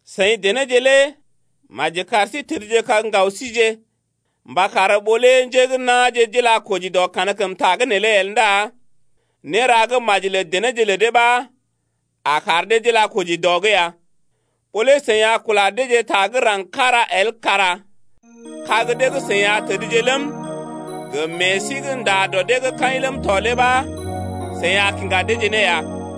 Seḭ denéje lé maji kar sí tədjekag ŋgaw síje mba kar ɓó lé njé gə́ na̰je d’ila koji dɔ kankəmta’g neelé ndá néra gə́ maji lə denéje lə dee ɓa a kar dee d’ila ne koji dɔ’g ya. Ɓó lé seḭ a kula deeje ta gə́ raŋg kára el kara kag dee gə́ seḭ a tədje ləm, gə meḛ sí gə́ nda dɔ dee’g kaḭ ləm tɔ lé ɓa seḭ a kiŋga deeje ne ya.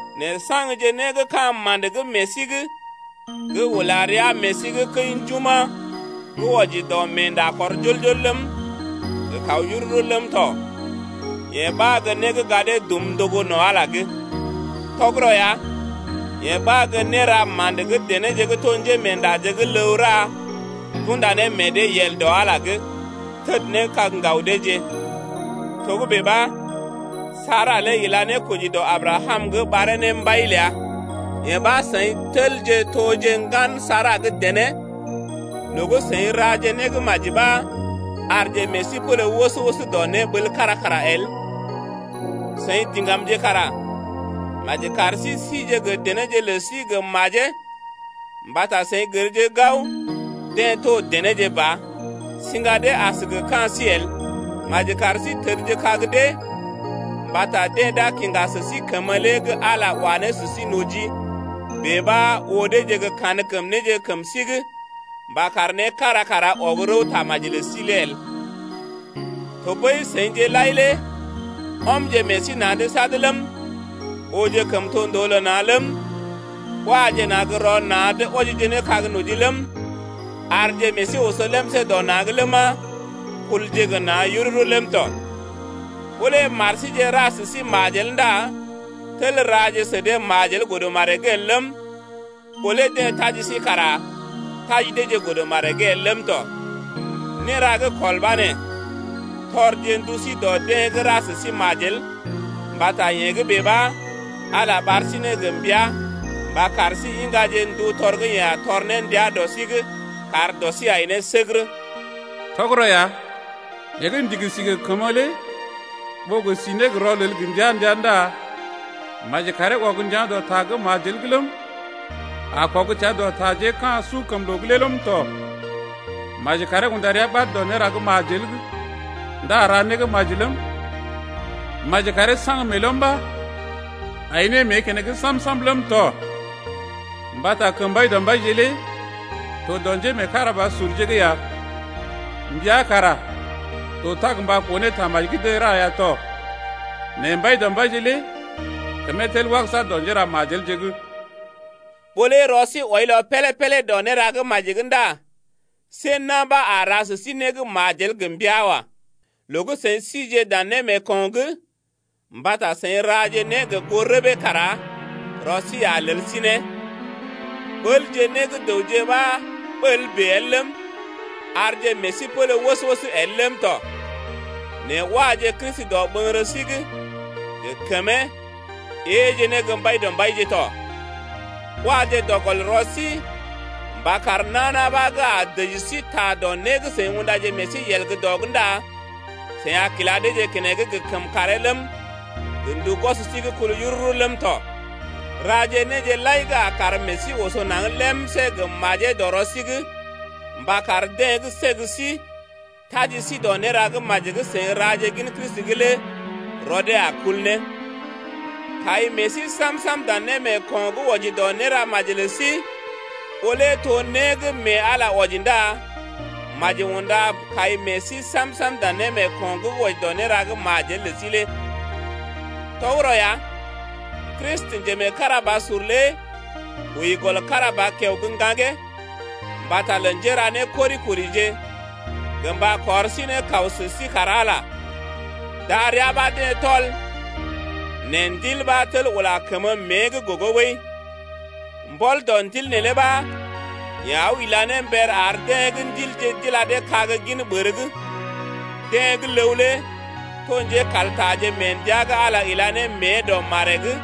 nɛ saŋgje né gə́ ka̰ ma̰də gə́ meḛ sí’g gə́ ula rəa meḛ sí’g kəi njuma̰ gə́ wɔji dɔ meenda kɔr jol-jol ləm, gə kaw yururu ləm tɔ yee ɓa gə́ né gə́ gadee dum ndogo no̰ Ala’g ya. Tɔgərɔ ya, yee ɓa gə́ néra ma̰də gə́ denéje gə́ to njémeendaje gə́ ləw ra d’unda ne meḛ dee yel dɔ Ala’g, təd ne kag ŋgaw deeje. Togə́bè ɓa, Sara lé ila ne koji dɔ Abrakam’g ɓaree ne mbai ləa. Yee ɓa seḭ tel toje ŋgan Sara gə́ dené loo gə́ seḭ raje né gə́ maji ɓa arje meḛ sí pélé wəs-wəs dɔ néɓəl’g kára kara el lé. Seḭ diŋgamje kara maji kar sí sije gə denéje lə sí gə majee mbata seḭ gərje gao deḛ to denéje ba, siŋga dee as gə ka̰ sí el. Maji kar sí tədjekag dee mbata deḛ d’a kiŋga sə sí kəmə lé gə́ Ala wa ne sə sí noji, bèe ɓa oo deeje gə́ kankəm néje kəm sí’g mba kar né kára kara ɔg rəw tamaji lə sí el. Tɔɓəi seḭje lai lé ɔmje meḛ sí na̰’d sad ləm, ooje kəmtondoo lə na̰ ləm, waje na̰ gə́ rɔ na̰’d wɔjije ne kag noji ləm, arje meḛ sí oso lemsé dɔ na̰’g ləma, kulje gə na̰ yururu ləm tɔ. Ɓó lé mar síje ra sə sí majel ndá tel raje sə dee majel godə maree’g el ləm, ɓó lé deḛ taji sí kara taji deeje godə maree’g el ləm tɔ. Néra gə́ kɔl ɓa nee: Tɔrje ndu sí dɔ deḛ gə́ ra sə sí majel mbata yee gə́ bèe ɓa, Ala ɓar sí ne gə mbəa mba kar sí iŋgaje ndu tɔr gə́ yeḛ a tɔr ne ndia dɔ sí’g kar dɔ sí ai ne səgərə. Tɔgərɔ ya. Yeḛ gə́ ndigi si gə kəmə lé Ɓó gə si ne rɔlel gə ndəa-ndəa Ndá maji karee ɔg ndəa̰ dɔ ta gə́ majel’g ləm, A kɔg təa dɔ taje gə́ ka̰ sukəmloo’g lé ləm tɔ. Maji karee unda rəa ɓad dɔ néra gə́ majel’g Ndá ra né gə́ maji ləm, Maji karee saŋg meelɔm ɓa ai ne mée keneŋ sam-sam ləm tɔ. Mbata kəm Mbaidɔmbaije lé to dɔ njémeekarabasurje’g ya, Mbia kara to tag gə mba koo ne tamaji gə́ deḛ ra ya tɔ. Nɛ Mbaidɔmbaije lé kəmee tel wagəsa dɔ njéramajelje’g. Ɓó lé rɔ sí wɔilɔ pélé-pélé dɔ néra gə́ maji’g ndá see na̰ ɓa a ra sə sí né gə́ majel gə mbəa wa. Loo gə́ seḭ sije dan némeeko̰’g mbata seḭ raje né gə goo rəbee kara rɔ sí a lel sí ne. Ɓəlje né gə́ dəwje ɓa ɓəl bèe el ləm, arje meḛ sí pélé wəs-wəs el ləm tɔ. Nɛ waje Kristi dɔɓəŋgərə sí’g gə kəmee, éeje ne gə́ Mbaidɔmbaije tɔ. Waje dɔ gɔl rɔ sí mba kar nana ɓa gə́ a dəji sí ta dɔ né gə́ seḭ undaje meḛ sí yel dɔ’g ndá seḭ a kila deeje keneŋ gə kəmkàree ləm, gə ndu gwɔs sí gə́ kul yururu ləm tɔ. Raje néje lai gə́ a kar meḛ sí oso naŋg lemsé gə́ majee dɔ rɔ sí’g mba kar deḛ gə́ səg sí, taji sí dɔ néra gə́ maji gə́ seḭ raje gin Kristi’g lé rɔ dee a kul ne. Kai meḛ sí sam-sam dan némeeko̰ gə́ wɔji dɔ néra maji lə sí, ɓó lé to né gə́ mee Ala wɔji ndá maji unda kai meḛ sí sam-sam dan némeeko̰ gə́ wɔji dɔ néra gə́ majel lə sí lé. Tɔgərɔ ya, Kristi, njemeekarabasur lé wəi gɔl kára ba kiao gə́ ŋgaŋgee mbata lə njéra né kori-korije gə mba kɔr sí ne kaw sə sí kar Ala ya, darəa ɓa deḛ tɔl nɛ Ndil ɓa tel ula kəmə mée’g gogo ɓəi. Mbɔl dɔ Ndil neelé ɓa, yeḛ aw ila ne mber ar deḛ gə́ ndilje d’ila dee kag gin ɓər’g lé. Deḛ gə́ ləw lé to njékaltaje mee ndəa gə́ Ala ila ne mée dɔ maree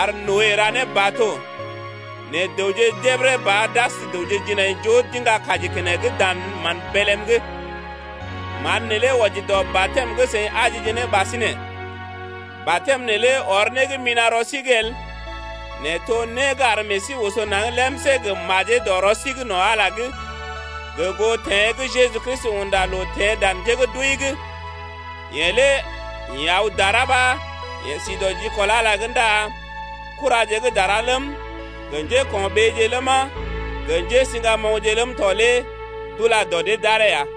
ar Noe ra ne bato, nɛ dəwje jebəre ba d’as dəwje jinaijoo d’iŋga kaji keneŋ dan mán bélm’g. Man neelé wɔji dɔ batɛm gə́ seḭ ajije ne ɓasinè. Batɛm neelé ɔr né gə́ mina̰ rɔ sí’g el nɛ to né gə́ ar meḛ sí oso naŋg lemsé gə́ majee dɔ rɔ sí’g no̰ Ala’g, gə goo teḛ gə́ Jeju Kristi unda loo teḛ dan njé gə́ d’wəi’g lé. Yeḛ lé ḭ aw dara ɓa yeḛ si dɔ jikɔl Ala’g ndá kuraje gə́ dara ləm gə njéko̰ɓeeje ləma gə njésiŋgamoŋje ləm tɔ lé d’ula dɔ dee d’aree ya.